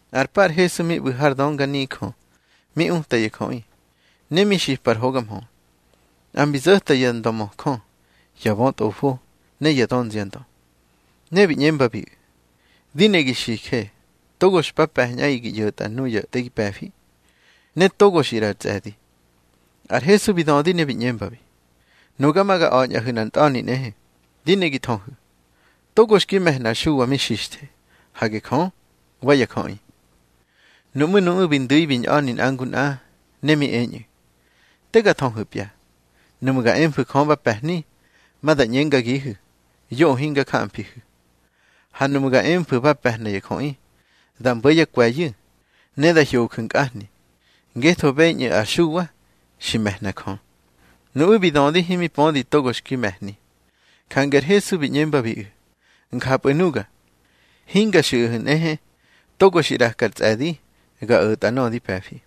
Nꞌar pa ar Hesu mi ꞌbu̱ har dönganijö mi uta ya jöꞌi, ne mi xipa ar hoga mhö. Nꞌa mbi zo̱ta ya ndömöjö, ya bötꞌofo, ne ya dönziandö. Ne bi ꞌñembabiꞌu̱: —Di ne gi xije, togo xpa pe̱ñꞌaꞌi gi ꞌyo̱tꞌa nuya te gi pe̱fi, ne togo xi ꞌraꞌa ar tsꞌe̱di. Ar Hesu bi dödi ne bi ꞌñembabi: —Nuga ma ga a̱ñꞌahu̱ nꞌar ntꞌa̱ni nꞌehe. Di ne gi thöhu̱: Togo xki me̱hna ar Xuwa mi xixthe. Hage Jö, wa ya jöꞌi. Nuꞌmú̱ nuꞌu̱ bi ndu̱i bi ñꞌa̱ni nꞌa ngu nꞌa, ne mi eñꞌu̱: —Te ga thöhu̱pya. Nuꞌmu̱ ga emfu̱ Jö ba pe̱hni, ma da ꞌñengagihu̱: Yoꞌö hinga jamfihu̱. Ha nuꞌmu̱ ga emfu̱ ba pe̱hna ya jöꞌi, da mbo̱ yá kwe̱yu̱, ne da hyoju̱ nkꞌahni, ngetho beñꞌu̱ ar Xuwa xi me̱hna Jö. Nuꞌu̱ bi dödi himi pödi togo xki me̱hni. Jange ar Hesu bi ꞌñembabiꞌu̱: —Njapꞌu̱ nuga, hinga xiꞌahu̱ nꞌehe togo xi ꞌraka ar tsꞌe̱di ga o̱tꞌa nöꞌö di pe̱fi.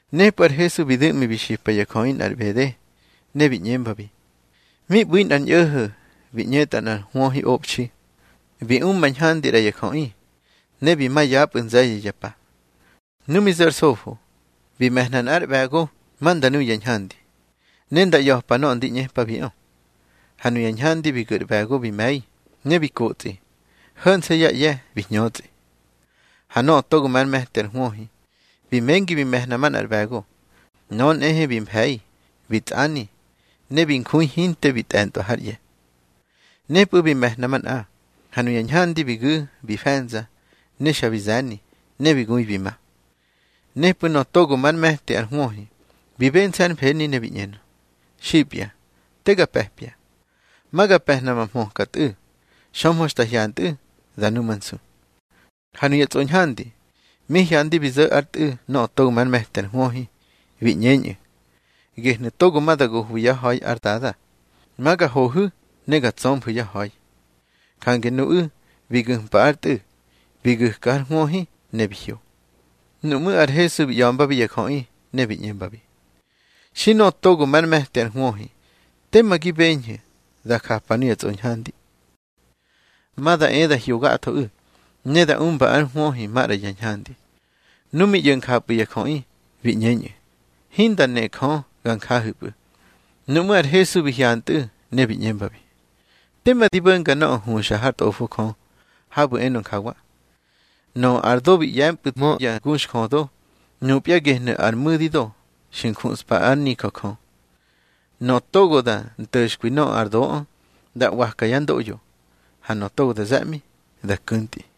Nepꞌu̱ ar Hesu bi du̱ꞌmi bi xipa ya jöꞌi nꞌar ꞌbede, ne bi ꞌñembabi: —Mi ꞌbu̱ nꞌar ñꞌo̱ho̱ bi ꞌñetꞌa nꞌar hwöhiꞌobxi. Bi umba ñhandi ꞌra ya jöꞌi, ne bi ma yapꞌu̱ nze̱ye̱ ya pa. Nu mi zo̱ ar sofo, bi me̱hna nꞌár ꞌbe̱go ma nda nu ya ñhandi, ne nda ꞌya̱pa nöꞌö ndi ꞌñepabiꞌö. Ha nuya ñhandi bi gu̱ ar ꞌbe̱go bi me̱i, ne bi kotsꞌi, ho̱nse̱ yá ꞌye̱ bi hñötsꞌi. Ha nöꞌö togo már me̱ti ar hwöhi, bi mengi bi me̱hna manꞌar ꞌbe̱go. Nöꞌö nꞌehe bi mfe̱i, bi tsꞌani, ne bi njui hinte bi tꞌe̱ntꞌwa hár ꞌye̱. Nepꞌu̱ bi me̱hna manꞌa. Ha nuya ñhandi bi gu̱ bi fe̱nza, ne xa bi ze̱ni, ne bi gui bi ma. Nepꞌu̱ nöꞌö togo már me̱ti ar hwöhi bi bense̱ hár mfeni, ne bi ꞌñenö: Xipya, te ga pe̱pya. Ma ga pe̱hna ma hmöka tꞌu̱. Xömhö xta hyantꞌu̱, da numansu. Ha nuya tsꞌoñhandi, mi hyandi bi zo̱ ár tꞌu̱ nöꞌö togo már me̱ti ar hwöhi, bi ꞌñeñꞌu̱: Gehnu̱ togo ma da gohwi yá ha̱i ár dada. Ma ga hohu̱ ne ga tsömfu̱ yá ha̱i. Jange nuꞌu̱ bi gu̱mpa ár tꞌu̱, bi gu̱ka har hwöhi, ne bi hyo. Nuꞌmú̱ ar Hesu bi ꞌya̱mbabi ya jöꞌi, ne bi ꞌñembi: —Xi nöꞌö togo már me̱ti ar hwöhi, tema gi beñhu̱ da japa nuya tsꞌoñhandi. Ma da e da hyo gathoꞌu̱, ne da umba ár hwöhi maꞌra ya ñhandi. Nu mi ꞌyo̱ njapꞌu̱ ya jöꞌi, bi ꞌñeñꞌu̱: —Hinda ne Jö ga njahu̱pꞌu̱. Nuꞌmú̱ ar Hesu bi hyantꞌu̱, ne bi ꞌñembabi: —Tema di bo̱nga nöꞌö huxa hár Tꞌofo Jö, habu̱ enö njawa: Nöꞌö ar do bi ꞌye̱mpꞌu̱hmö ya guxjödo, nupya gehnu̱ ar mu̱dido xi njuꞌspa ár nijö Jö. Nöꞌö togo da nto̱xkwi nöꞌö ar doꞌö, da ꞌwaka yá ndoꞌyo. Ha nöꞌö togo da ze̱ꞌmi, da ku̱ntꞌi.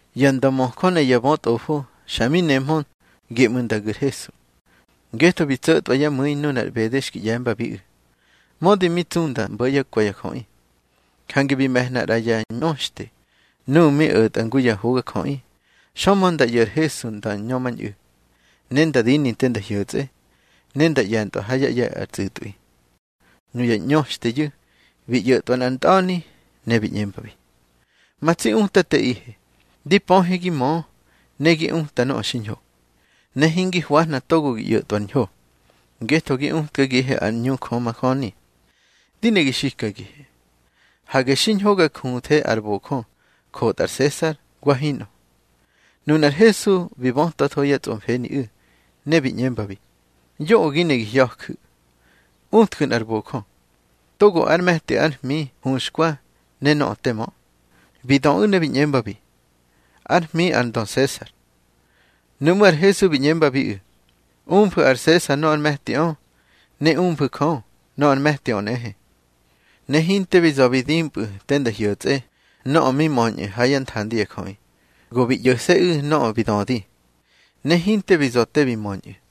Ya ndömöjö ne ya bötꞌofo xa mi nehmö geꞌmu̱ nda gu̱ ar Hesu, ngetho bi tso̱tꞌwa yá mu̱i nunar ꞌbede xki ꞌye̱mbabiꞌu̱. Mödi mi tsu nda mbo̱ yá kwe̱ ya jöꞌi. Jange bi me̱hna ꞌra ya ꞌñöxte nuꞌu̱ mi o̱tꞌa ngu ya hogajöꞌi, xömhö nda ꞌyo̱ ar Hesu nda ñömañꞌu̱, ne nda dini te nda hyo̱tsꞌe, ne nda ꞌye̱ntꞌwa ár ꞌye̱ ar tsꞌu̱tꞌwi. Nuya ꞌñöxteyu̱ bi ꞌyo̱tꞌwa nꞌar ntꞌa̱ni, ne bi ꞌñembabi: —Ma tsi Utateꞌihe, di pöhe gi mö ne gi uta nöꞌö xiñho, ne hingi hwahna togo gi o̱tꞌwa ar ñho, ngetho gi utkagihe ár ꞌñu Jö majöni. Di ne gi xikagihe, hage xiñho ga juthe ar bojö jotꞌa ar Sesar, wa hinꞌö. Nunar Hesu bi bötwatho yá tsꞌomfeniꞌu̱, ne bi ꞌñembabi: —Yoꞌö gi ne gi hya̱ju̱. Utju̱ nꞌar bojö. Togo ár me̱ti ar hmi huxkwa ne nöꞌö te mö. Bi döꞌu̱ ne bi ꞌñembabi: —Ár hmi ar ndö Sesar. Nuꞌmú̱ ar Hesu bi ꞌñembabiꞌu̱: —Umfu̱ ar Sesar nöꞌö ár me̱tiꞌö, ne umfu̱ Jö nöꞌö ár me̱tiꞌö nꞌehe. Ne hinte bi za̱ bi dimpꞌu̱ te nda hyo̱tsꞌe nöꞌö mi möñꞌö ha yá nthandi ya jöꞌi. Go bi ꞌyo̱se̱ꞌu̱ nöꞌö bi dödi, ne hinte bi za̱ te bi möñꞌu̱.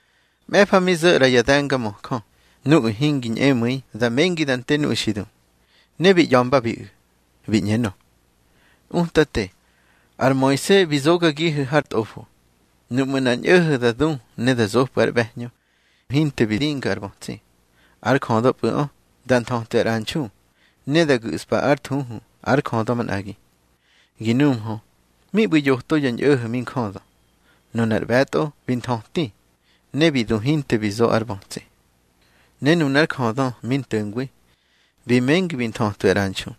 Mꞌe̱fa mi zo̱ ꞌra ya de̱ngamöjö nuꞌu̱ hingi ñꞌemu̱i da mengi da nte nuꞌu̱ xi du. Ne bi ꞌya̱mbabiꞌu̱, bi ꞌñenö: —Utate, ar Moise bi zogagihu̱ har tꞌofo, nuꞌmu̱ nꞌar ñꞌo̱ho̱ da du ne da zopꞌu̱ ár ꞌbe̱hñö hinte bi dinga ar bötsi, ár jödöpꞌu̱ꞌö da nthötwi ar ꞌranxu, ne da gu̱ꞌspa ár thuhu ár jödö manꞌagi. Gi nuhmö, mi ꞌbu̱ yoto ya ñꞌo̱ho̱ mi njödö. Nunar ꞌbe̱tꞌo bi nthöti, ne bi du hinte bi zo ar bötsi. Ne nunár jödö mi nto̱ngwi bi mengi bi nthötwi ar ꞌranxu.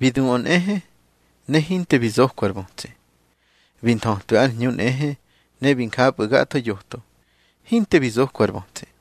Bi duꞌö nꞌehe, ne hinte bi zokwa ar bötsi. Bi nthötwi ár hñu nꞌehe, ne bi njapꞌu̱ gatho yoto, hinte bi zokwa ar bötsi.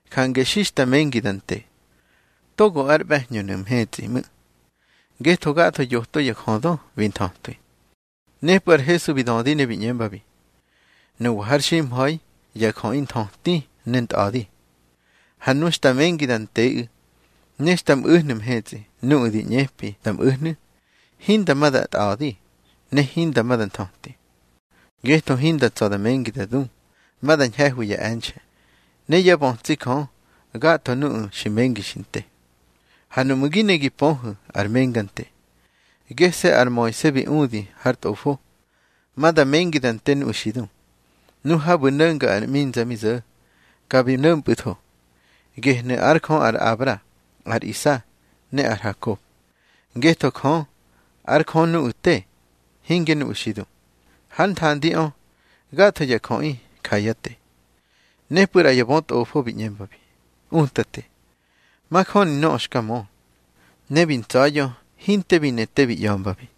Jange xi xta mengi da nte, togo ár ꞌbe̱hñönu̱ mhetsꞌi ꞌmu̱. Ngetho gatho yoto ya jödö bi nthötwi. Nepꞌu̱ ar Hesu bi dödi ne bi ꞌñembabi: —Nuwa har ximha̱i ya jöꞌi nthöti ne ntꞌa̱di. Ha nu xta mengi da nteꞌu̱, ne xta mꞌu̱hnu̱ mhetsꞌi nuꞌu̱ di ꞌñepi da mꞌu̱hnu̱, hinda ma da tꞌa̱di, ne hinda ma da nthöti. Ngetho hinda tsa̱ da mengi da du. Ma da ñhe̱hwi ya e̱nxe̱, ne yá bötsi Jö gatho nuꞌu̱ xi mengi xi nte. Ha nuꞌmu̱ gi ne gi pöhu̱ ar menga nte, gese̱ ar Moise bi udi har Tꞌofo, ma da mengi da nte nuꞌu̱ xi du. Nu habu̱ no̱nga ar ꞌminza mi zo̱, ka bi no̱mpꞌu̱tho: Gehnu̱ ár Jö ar Abra, ar Isa, ne ar Hakob. Ngetho Jö, ár Jö nuꞌu̱ te, hinge nuꞌu̱ xi du. Hár nthandiꞌö, gatho ya jöꞌi ja yá te. Nepꞌu̱ ꞌra ya bötꞌofo bi ꞌñembabi: —Utate, majöni nöꞌö xka mö. Ne bi ntsa̱ya̱ hinte bi ne te bi ꞌya̱mbabi.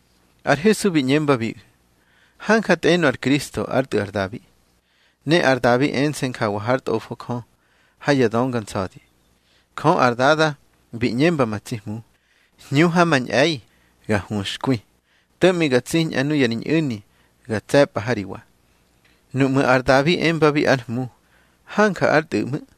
Ar Hesu bi ꞌñembabiꞌu̱: —Hanja tꞌenö ar Kristo ár tꞌu̱ ar Dabi. Ne ar Dabi ense̱ njawa hár Tꞌofo Jö ha ya Dönga Nsa̱di: Jö ar Dada bi ꞌñemba ma tsi Hmu: Hñu ha ma ñꞌe̱i ga huxkwi, to̱ꞌmi ga tsiñꞌa nuya ri ñꞌu̱ni ga tse̱pꞌa ha ri wa. Nuꞌmu̱ ar Dabi embabi ár Hmu, hanja ár tꞌu̱ ꞌmu̱.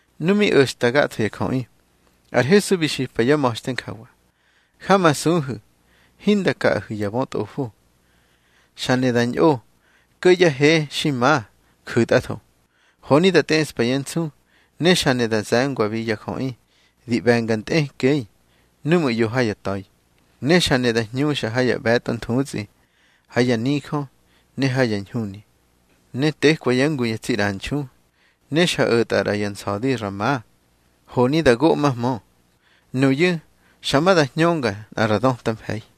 Nu mi o̱xta gatho ya jöꞌi, ar Hesu bi xipa yá ma̱xte njawa: —Jamasuhu̱ hinda kaꞌahu̱ ya bötꞌofo. Xa ne da ñꞌo ko̱ yá he xi ma ju̱tꞌatho, honi da tꞌeꞌspa yá nsu. Ne xa ne da ze̱ngwabi ya jöꞌi di ꞌbe̱nga ntꞌekꞌei núꞌmu̱ ꞌyo ha ya ta̱i. Ne xa ne da hñuxa ha ya ꞌbe̱tꞌo nthutsꞌi ha ya nijö ne ha ya ñhuni. Ne tekwa yá ngu ya tsi ꞌranxu, ne xa o̱tꞌa ꞌra ya nsa̱di ra ma, honi da goꞌmahmö. Nuyu̱ xa ma da hñönga nꞌa ra döta mfe̱i.